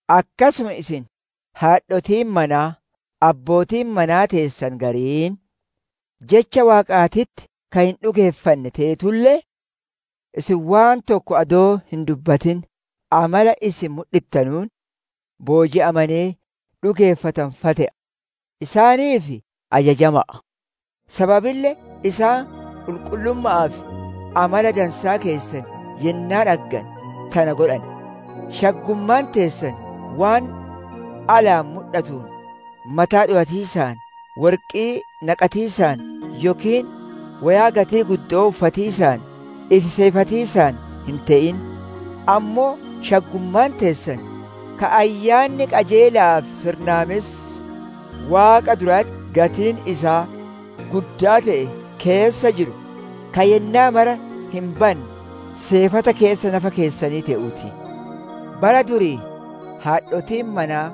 Akkasuma isin haadhotiin manaa, abbootiin manaa teessan gariin, Jecha Waaqaatitti ka hin dhugeeffanne teetulle, isin waan tokko adoo hin dubbatin amala isin mudhittanuun booji'amanee dhugeeffatan fa'a te'a, isaaniif ajajama'a. Sababille isaan qulqullumma'aa fi amala dansaa keessan yennaa dhaggane tana godhan. Shaggummaan teessan waan alaan mudhatuun mataa dhowatiisaan, worqii naqatiisaan, yookiin woyaa gatii guddo'oo uffatiisaan ifi seefatiisaan hin te'in. Ammoo shaggummaan teessan, ka ayyaanni qajeela'aa fi sirnaamessi Waaqa duratti gatiin isaa guddaa te'e keessa jiru, ka yennaa mara hin banne, seefata keessa nafa keessanii te'uu ti. Bara durii haadhotiin manaa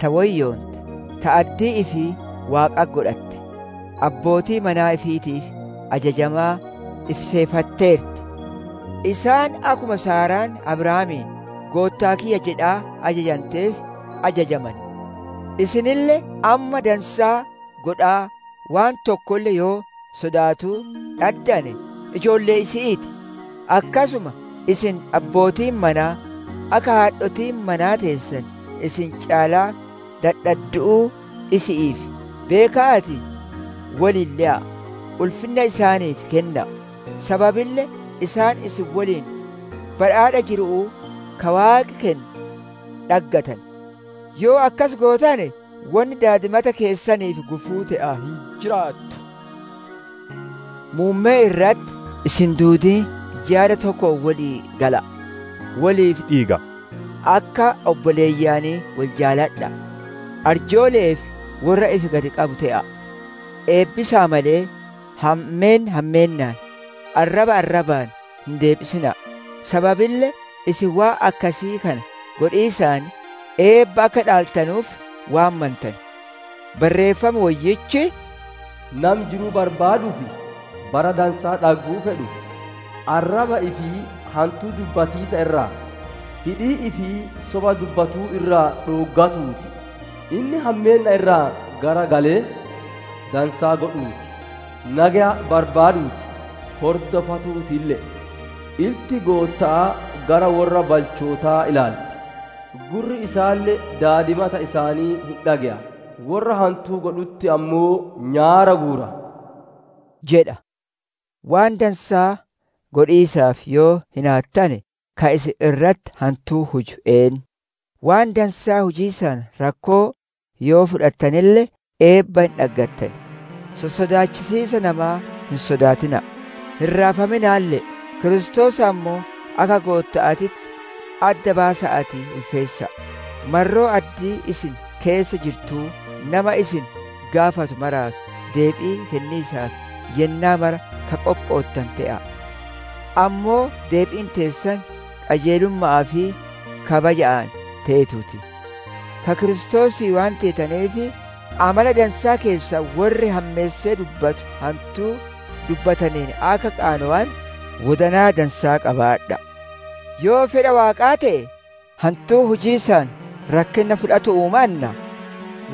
ta woyyoonte, ta addii ifii Waaqatti godhatte, abbootii manaa ifiitiif ajajamaa ifi seefatteerti. Isaan akkuma Saaraan Abrahaamiin, «Goottaa kiyya» jedhaa ajajanteef ajajamane. Isinille amma dansaa godhaa waan tokkolle yoo sodaatuu dhaddane ijoollee isi'ii ti. Akkasuma isin abbootiin manaa, akka haadhotiin manaa teessan isin caalaa dadhaddu'uu isi'iif beeka'aatii woliin le'a'a; ulfinna isaaniif kenna'a; sababille isaan isin woliin badhaadha jiru'uu ka Waaqi kennu dhaggatan. Yoo akkas gootane wonni daadimata keessaniif gufuu te'aa hin jiraattu. Muummee irratti, isin duudiin yaada tokkoon wolii gala'a; woliif dhiiga'a; akka obboleeyyanii wol jaaladha'a; arjoole'ee fi worra ifi gad qabu te'a'a. Eebbisa'a malee, hammeenna hammeennaan, arraba arrabaan hin deebisina'a; sababille isin waan akkasii kana godhiisaan eebba akka dhaaltanuuf waammantane. Barreeffam Woyyichi, «Nami jiruu barbaaduu fi bara dansaa dhagguu fedhu, arraba ifii hantuu dubbatiisa irraa, hidhii ifii soba dubbatuu irraa dhooggatuu ti. Inni hammeenna irraa garagalee dansaa godhuu ti. Nageya barbaaduu ti; hordofatuutille'e. Ilti Gootta'aa gara worra balchootaa ilaalti; gurri isaalle daadimata isaanii hin dhage'a; worra hantuu godhutti ammoo nyaara guura» jedha. Waan dansaa godhiisaaf yoo hinaattane ka isin irratti hantuu huju eennu? Waan dansaa hujiisaan rakkoo yoo fudhattanelle eebba hin dhaggattan; sossodaachisiisa namaa hin sodaatina'a; hin raafaminaalle'e. Kiristoos ammoo akka Gootta'aatitti adda baasa'aatii ulfeessa'a. Marroo addii isin keessa jirtuu, nama isin gaafatu maraaf deebii kenniisaaf yennaa maraa ka qophoottane te'a'a. Ammoo deebiin teessan qajeelumma'aa fi kabajja'aan teetuu ti. Ka Kiristoosii waan teetaneef, amala dansaa keessan worri hammeessee dubbatu hantuu dubbataneen akka qaanowanu wodanaa dansaa qabaadha'a. Yoo fedha Waaqaa te'e, hantuu hujiisaan rakkinna fudhatu'uu mannaa,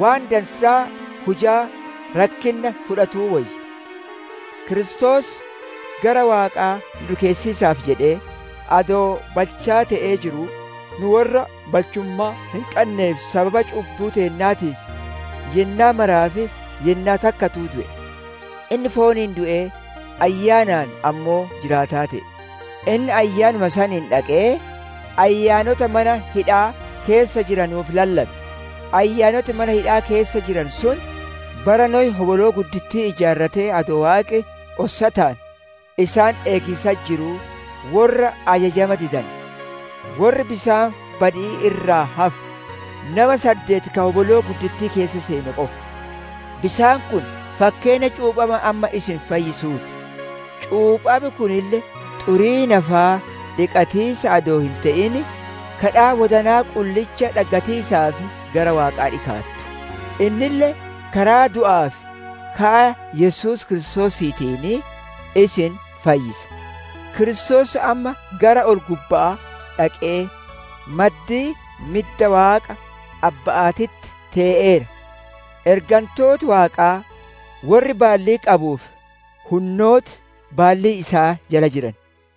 waan dansaa hujaa rakkinna fudhatuu woyya. Kiristoos gara Waaqaa nu dhikeessiisaaf jedhee, adoo balchaa te'ee jiruu, nu worra balchummaa hin qanneef sababa cubbuu teennaatiif, yennaa maraaf yennaa takkatuu du'e. Inni fooniin du'ee ayyaanaan ammoo jiraataa te'e. Inni Ayyaanuma saniin dhaqee ayyaanota mana hidhaa keessa jiranuuf lallabe. Ayyaanoti mana hidha'aa keessa jiranu sun, bara Nohi hoboloo guddittii ijaarrate adoo Waaqi ossataan isaan eegiisatti jiruu worra ajajama didane. Worri bisaan badi'ii irraa hafe, nama saddeet ka hoboloo guddittii keessa seene qofa. Bisaan kun fakkeenna cuuphama amma isin fayyisuu ti; cuuphami kunille xurii nafaa dhiqatiisa adoo hin te'in, gaaffii wodanaa qullicha dhaggatiisaaf gara Waaqaa dhikaattu. Innille karaa du'aa fi ka'a Yesuus Kiristoosiitiin isin fayyisa. Kiristoos amma gara ol gubba'aa dhaqee maddii midda Waaqa Abba'aatitti tee'eera; ergantooti Waaqaa, worri baallii qabuu fi hunnooti, baallii isaa jala jiran.